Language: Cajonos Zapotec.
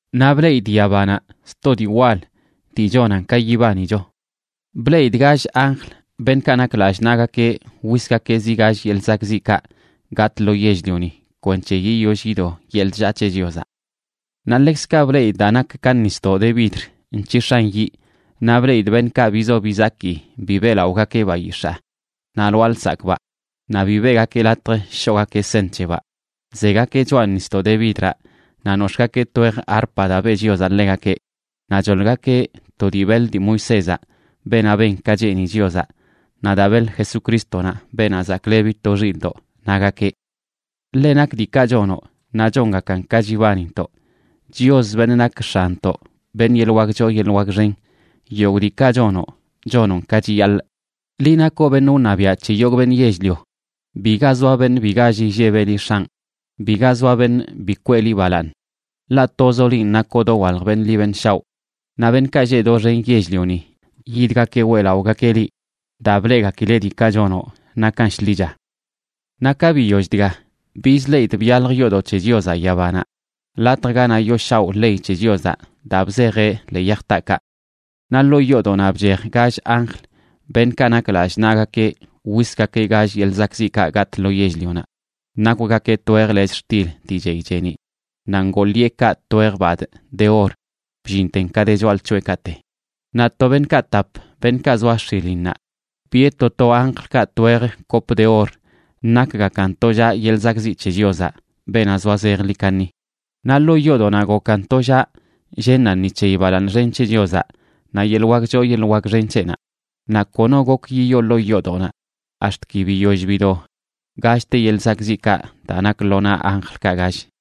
Naꞌ bleꞌidꞌ yabanaꞌ sto dii wal, dii chonan ka yibanicho. Bleꞌidꞌ gall anjl, beṉꞌkaꞌ nak lallꞌ naꞌgakeꞌ wisgakeꞌ zi gall yeḻꞌ zakꞌziꞌkaꞌ gatꞌ lo yell-lioni kwenc̱he yiyoll yido yeḻꞌ chllaa c̱he Chiozaꞌ. Naꞌ ḻekzkaꞌ bleꞌidꞌ daa nak ka nisdoꞌ de vidr nc̱hix̱an yiꞌ. Naꞌ bleꞌidꞌ beṉꞌkaꞌ bizo bizaki bi beꞌlaꞌogakeꞌ bayix̱aa naꞌ lwaa lsakꞌbaꞌ naꞌ bi beꞌgakeꞌ latj shoꞌgakeꞌ seṉ c̱hebaꞌ, zegakeꞌ choꞌa nisdoꞌ de vidraꞌ naꞌ nox̱ꞌgakeꞌ twej arpa daa beꞌ Chiozaꞌ ḻegakeꞌ. Naꞌ choḻgakeꞌ to dii beḻ dii Moisézaꞌ, beenaꞌ ben ka cheeni Chiozaꞌ, naꞌ daa beḻ Jesucrístonaꞌ, Beenaꞌ Zaklebi to Xilꞌdoꞌ, nagakeꞌ: Ḻe nak diikaꞌ chonoꞌ naꞌ chongakan ka chibanintoꞌ, Chios, beṉꞌ nak X̱anntoꞌ, beṉꞌ yeḻꞌ wak choo yeḻꞌ wak xen. Yogꞌ diikaꞌ chonoꞌ, chonoꞌn ka chiyaḻꞌ, liꞌ nakoꞌ beṉꞌ wṉabiaꞌ c̱he yogꞌ beṉꞌ yell-lio. Biga zoa beṉꞌ bi gall illebeꞌ liꞌ, X̱anꞌ. Biga zoa beṉꞌ bi kweꞌ liꞌ balaaṉ. Ḻaꞌ tozoꞌ linꞌ nakoꞌ dowalj beṉꞌ ḻi beṉꞌ shaoꞌ. Naꞌ beṉꞌkaꞌ lleꞌ doxen yell-lioni yidgakeꞌ weꞌlaꞌogakeꞌ liꞌ, daa bleꞌgakileꞌ diikaꞌ chonoꞌ nakan shḻicha. Naꞌ ka biyoll dga, bizleꞌidꞌ byalj yoodoꞌ c̱he Chiozaꞌ yabanaꞌ, latj ganaꞌ yooshaoꞌ ley c̱he Chiozaꞌ daa bzejeꞌ ḻee yaj taakaꞌ. Naꞌ ḻoo yoodoꞌnaꞌ bchej gall anjl, beṉꞌkaꞌ nak lallꞌ naꞌgakeꞌ wisgakeꞌ gall yeḻꞌ zakꞌziꞌkaꞌ gatꞌ lo yell-lionaꞌ. Nakwgakeꞌ twej lechꞌ xtil dii chey cheeniꞌ naꞌ ngoo ḻiꞌekaꞌ twej badꞌ de or bllinten ka de choꞌalc̱hoꞌekaꞌte. Naꞌ to beṉꞌkaꞌ tap, beṉꞌkaꞌ zoa x̱ilinnaꞌ, biꞌe to to anjlkaꞌ twej kop de or nakgakan tollaꞌ yeḻꞌ zakꞌziꞌ c̱he Chiozaꞌ, beenaꞌ zoa zejḻi kaṉi. Naꞌ ḻoo yoodoꞌnaꞌ gokan tollaꞌ llennaꞌ ni c̱heyi balaaṉ xen c̱he Chiozaꞌ naꞌ yeḻꞌ wak choo yeḻꞌ wak xen c̱heꞌnaꞌ. Naꞌ kono gok yiyoo ḻoo yoodoꞌnaꞌ ax̱t ki biyoll bido gallte yeḻꞌ zakꞌziꞌkaꞌ daa nak lo naꞌ anjlkaꞌ gall.